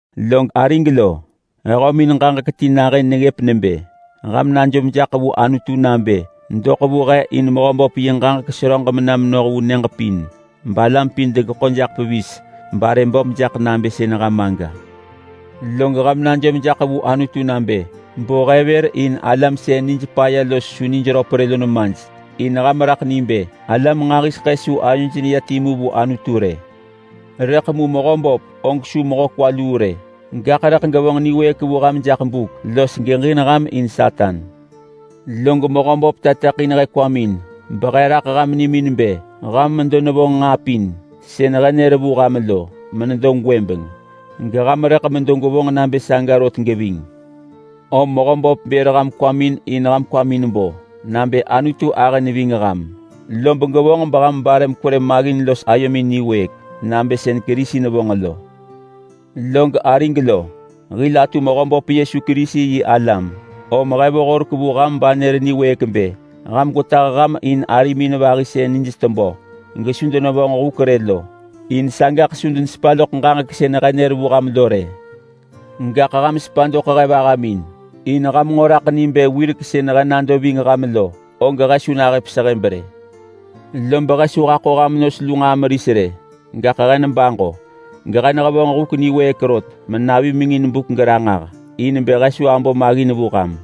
Log arig lo, he hömin ġaġek ti nahën neggëp nebë: Ham najom jaḳ vu Anutu nabë doḳ vu he in Mehöböp yi ġaġek seröġ mena menoh vu nyëġ pin, balam pin degeḳo jaḳ pevis barë böp jaḳ nabë sën ham aga. Log ham najom jaḳ vu Anutu nabë bo he vër in alam sën nij paya los su nij röp rë lo nemaj, in ham raḳ ni bë alam nġahiseḳë su ayoj neya timu vu Anutu rë. Rëḳ mu Mehöböp og su mehö kwa luu rë, gaḳ rëḳ gevonġ niwëëk vu ham jaḳ buk los geġin ham in Satan. Log Mehöböp tateḳin he kwamin behe raḳ ham nimin bë ham medo nevonġ nġaa pin sën he nër vu ham lo gwëbeng menedo, geham rëḳ medo gwevonġ nabë saga rot geving. Om Mehöböp bër ham kwamin in ham kwamin bo nabë Anutu ahë neving ham, lob gevonġ beham bare mekwerë maggin los ayomin niwëëk nabë sën Kerisi nevonġ lo. Log arig lo, hil atu Mehöböp Yesu Kerisi yi alam, om he vo horek vu ham banër niwëëk bë: Ham gwetah ham in arimin vahi sën nij tebö gesu denevonġ huk rë lo, in sagaḳ su denesepa loḳ ġaġek sën he nër vu ham lo rë. Gaḳ ham sepa doḳ he vahamin, in ham nġo raḳ ni bë wirek sën he nado ving ham lo, og he su nahëp sehëb rë. Lob he su haḳo ham nos lu nġaa meris rë. Gaḳ he nebaġo, gehe nehevonġ huk niwëëk rot menavimengin buk geranġah, in bë he su abo maggin vu ham.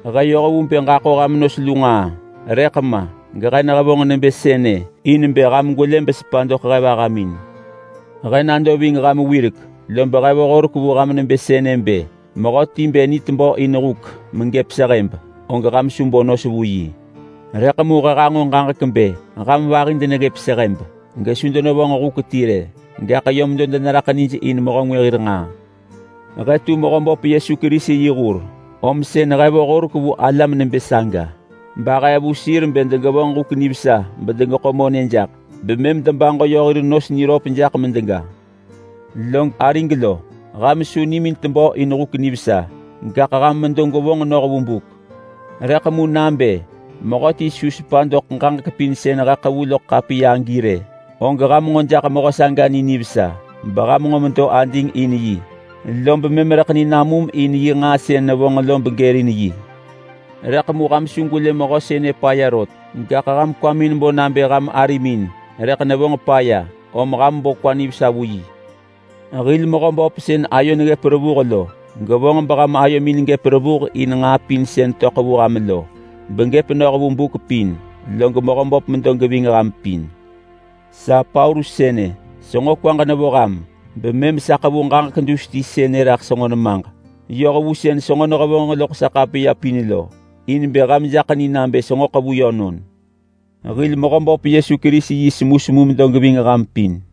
He yoh vu bë ġaḳo ham nos lu nġaa, rëḳ ma gehe nehevonġ nebë sënë in bë ham gwelë besepa doḳ he vahamin. He nado ving ham wirek, lob he vo horek vu ham nebë sënë bë: Mehöti bë ni tebö in huk megëp sehëb, og ham su bo nos vu yi. Rëḳ mu he hanġo ġaġek bë ham vahi deneggëp sehëb gesu denevonġ huk ti rë, gaḳ yö medo deneraḳ nij in mehö ngwë hir nġaa. He tu Mehöböp Yesu Kerisi yi hur om sën he vo horek vu alam nebë saga bahee vu sir bë degevonġ huk nivesa bedemedo gedegeḳo monë jaḳ, bemëm debaġo yö hir nos jaḳ medega niröp. Log arig lo, ham su nimin tebö in huk nivesa, gaḳ ham medo gwevonġ noh vu buk. Rëḳ mu nabë mehöti su sepa doḳ ġaġek pin sën he ḳevu loḳ ḳapiya agi rë, og ham nġo jaḳ mehö saga ni nivesa, beham nġo medo ading in yi. Lob mëm rëḳ ni namum in yi nġaa sën nevonġ lo begërin yi. Rëḳ mu ham su gwelë mehö sënë paya rot, gaḳ ham kwamin bo nabë ham arimin rëḳ nevonġ paya, om ham bo kwa nivesa vu yi. Hil Mehöböp sën ayo neggëp revuh lo gevonġ beham ayomin gëp revuh in nġaa pin sën töḳ vu ham lo, begëp noh vu buk pin. Log Mehöböp medo geving ham pin. Sa Paulus sënë, senġo kwaġ nevo ham bemëm sa ḳevu ġaġek dus ti sënë raḳ senġo nemaġ yoh vu sën sa nehevonġ loḳ sa ḳapiya pin lo, in bë ham jaḳ ni nabë senġo ḳevu yönon. Hil Mehöböp Yesu Kerisi yi semusemu medo geving ham pin.